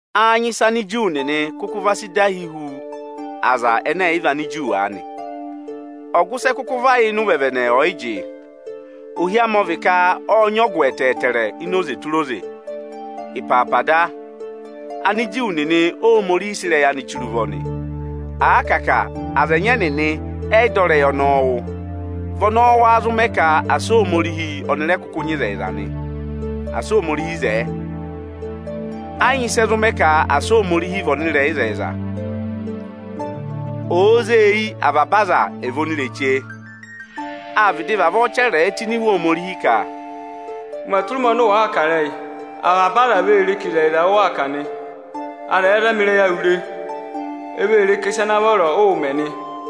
Â nyị ịsị Aniju nịnị kụkụ va sị dahi hu aza ẹnẹ ẹ̀yị vị Aniju aanị? Ọgụ ịsị ẹ kụkụ va yà ịnị ụvẹvẹnẹ ọyịjị? Ohi amị ọ vị ka ọ́ọ nyị ọgụ ẹtẹẹtẹrẹ ini oze tụra oze. Ịpaapa da, Aniju nịnị Óhomorihi sị ịrẹyị anị chire ụvọ nị. À kà a ka aza ẹnyị ẹnịnị ẹ yị dọ ịrẹyị ọnọọ wụ́, vị ọnọọ wáá zụ mẹ ka asị Ohomorihi ọnị rẹ kụkụ nyị ịzẹyịza nị? Asị Ohomorihi zẹẹ! Ẹ yị nyị ịsị ẹ zụ mẹ ka asị Ohomorihi vị ọnịrẹyịzẹyịza, òo zee eyi avaba aza ẹ̀ vị onireche. Â vịdị vavọọ chẹrẹẹ tụ́ ini Iwe Ohomorihi ka, “Ụmẹ tụra ụmẹ ọnị ụ wàa kà ịrẹyị, avaba aza vee ree ka ịzẹyịza ụ waa kà nị. Aza ẹ̀ẹ zama ịrẹyị awụ re, e vee re ka ịsa ana vọrọ ụụ̄ mẹ nị.”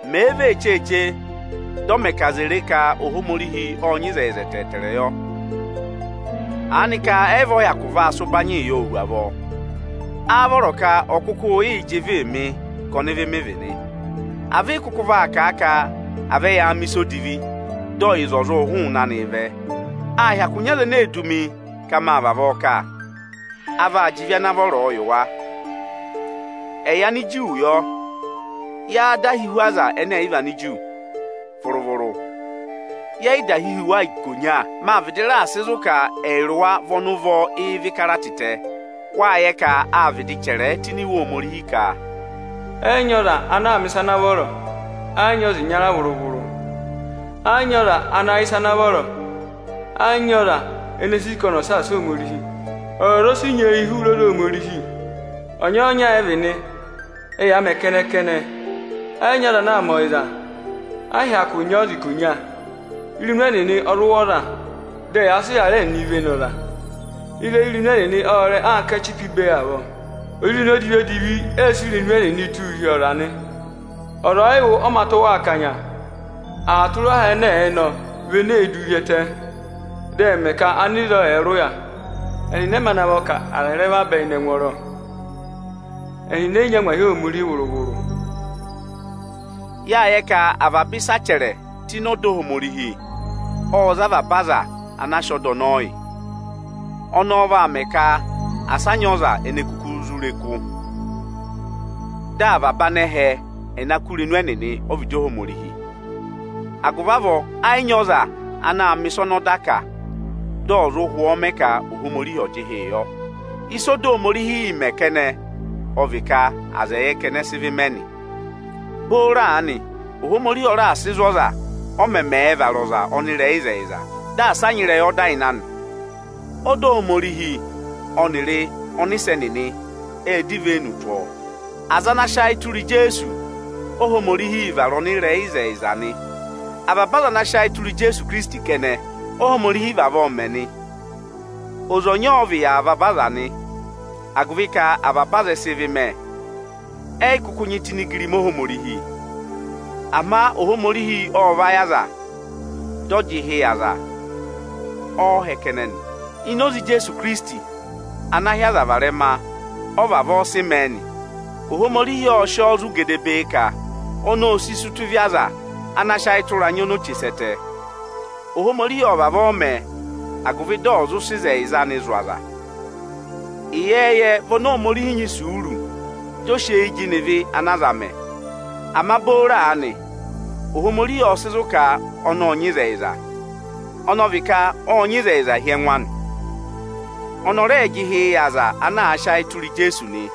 Mèe vee cheeche, dị ọ mẹ ka aza è re ka Ohomorihi ộ nyị ịzẹyịza ẹtẹẹtẹrẹ yọ? Aanịka ayị vị ọ hyakụ aa sị ụbanyịị yọọ hu avọọ? Â vọrọ ka ọ̀ kụkụ yịị jị ịvịị mị ka ọnịvị mị vị nị? A vị ị kụkụ vaa kà a ka: À vẹ yaa mẹ̀ ịsa odivi, dị ọyịza ọ̀ zụ hụụnị anị vẹẹ? Â hyakụ nyị aza ene ee du mi ka máa vavọọ kà. A vaa jị ịvị ana vọrọọ yị wa. Ẹyị Aniju yọ, yáá dahi hu aza ẹnẹ ẹ̀yị vị Aniju? Vụrụ-vụrụ, yẹ yị dahi hu wa ikonya! Máa vịdị raà sị zụ̀ ka ẹyịrị wa vị ọnị ụvọ ịvị kara tịtẹ. Wáa yẹ ka áa vịdị chẹrẹẹ tụ́ ini Iwe Ohomorihi ka, “Ẹ yị nyị ọza ana aa mẹ̀ ịsa ana vọrọ, ẹ yị nyị ọza ịnya vụrụ-vụrụ. Ẹ yị nyị ọza ana yẹ ịsa ana vọrọ, ẹ yị nyị ọza ene ee sì ka ọnị ọ̀ saasa Ohomorihi. Ọzọza o si nyeeyi hụrẹ oze Ohomorihi. Ọnyọọnya ẹ vị nị, ẹyaa mẹ kẹnẹ-kẹnẹ. Ẹyị nyị ọza ana aa mẹ ọyịza; ẹ yị hyakụ nyị ọza ikonya.” Irenu ẹnịnị ọ zụ wụ̀ ọza. Dị ẹyaa sị ịrarẹ ẹnịnịị vene ọza. Ịrẹyị irenu ẹnịnị ọ́ọ rẹ anka ẹchịpa ibe avọọ. Ozirenu odivi-odivi ẹẹ̄ sị irenu ẹnịnịị tụ́ụ hi ọza nị. Ọza ọyị wụ̀ ọ mā tụ́ wa akanya. Aha tụra aha ẹnẹ ẹ̀ẹ nọ vị ene eē duu hi ẹtẹ, dị ẹ mẹ ka anịzọọ ẹ̀ẹ rị ụya. Ẹnịnị ẹ mā navọ ka aza ẹ̀ ra vabẹ ịnị ẹngwọọrọ. Ẹnịnị ẹ yị nyị angwahi Ohomorihi vụrụ-vụrụ. Yáa yẹ ka avaba ịsị a chẹrẹ tụ́ ịnị ọda Ohomorihi ọ́ọ za a avaba aza anaa sị ọda ọnọọ yị. Ọnọọ vaa mẹ ka asị a nyị ọza ene kuku zụ re kụ́; dị avaba anẹhẹ ẹ̀ na kụ́ irenu ẹnịnị ọ́vịdị Ohomorihi. Agụvị avọọ ẹ yị nyị ọza ana mẹ̀ ịsa ọnị ọda kà dị ọ̀ zụ hwọọ mẹ ka Ohomorihi ọ̀ jị ịhị yọ. Ịsị ọda Ohomorihiī mẹ kẹnẹ ọ vị ka aza ẹ̀ yẹ ka ẹnị ẹ sị ịvị mẹ nị. Booro aanị, Ohomorihi ọ raà sị zụ̀ ọza, ọ mẹmẹẹ̄ vara ọza ọnịrẹyịzẹyịza; dị asa a nyị ịrẹyị ọda ịnị anị; ọda Ohomorihi ọnịrị ọnịsẹ nịnị ẹ́ẹ dọ ivenu tụ́ ọọ. Aza ana sị ayị tụra Ijeesu, Óhomorihiī vara ọnịrẹyịzẹyịza nị. Avaba aza ana sị ayị tụra Ijeesu Ikirisiti kẹnẹ, Óhomorihiī vavọọ mẹ nị. Oze ọnya ọ vị yị avaba aza nị, agụvị ka avaba aza ẹ sị ịvị mẹ, ẹ yị kụkụ nyị tụ́ ịnị igirima Ohomorihi. Ama Ohomorihi ọ́ọ vayị aza, dị ọ jị ịhị yị aza ọọhẹ kẹnẹ nị. Ini oze Ijeesu Ikirisiti ana hị́ aza varẹma ọ vavọọ sị mẹẹ nị. Ohomorihi ọ́ọ sị ọọ zụ̀ gedebee ka ọnị óo si sí ụta ịvị aza ana â sị ayị tụra anya oni o che sẹ́ ẹtẹ. Ohomorihi ọ́ọ vavọọ mẹ, agụvị dị ọ̀ zụ sị ịzẹyịza anị zụ̀ aza. Ịyẹẹyẹ vị oni Ohomorihi nyị isuuru, dị ọ sị eyi jịnẹ ịvị ana aza aa mẹ. Ama booro aanị, Ohomorihi ộ sị zụ̀ ka ọnị ộ nyị ịzẹyịza, ọnị ọ vị ka ộ nyị ịzẹyịza hi ẹngụ anị. Ọnị ọ rẹẹ̄ jị ịhị yị aza ana àa sị ayị tụra Ijeesu nị.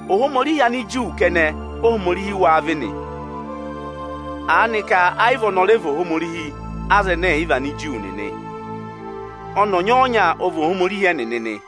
Ohomorihi Aniju kẹnẹ Óhomorihi wâ vị nị? Aanị ka ẹ yị vị ọnị ọ rẹ vị Ohomorihi Anigiriki nịnị? Ọnị ọnyọọnya ọ vị Ohomorihi ẹnịnị nị,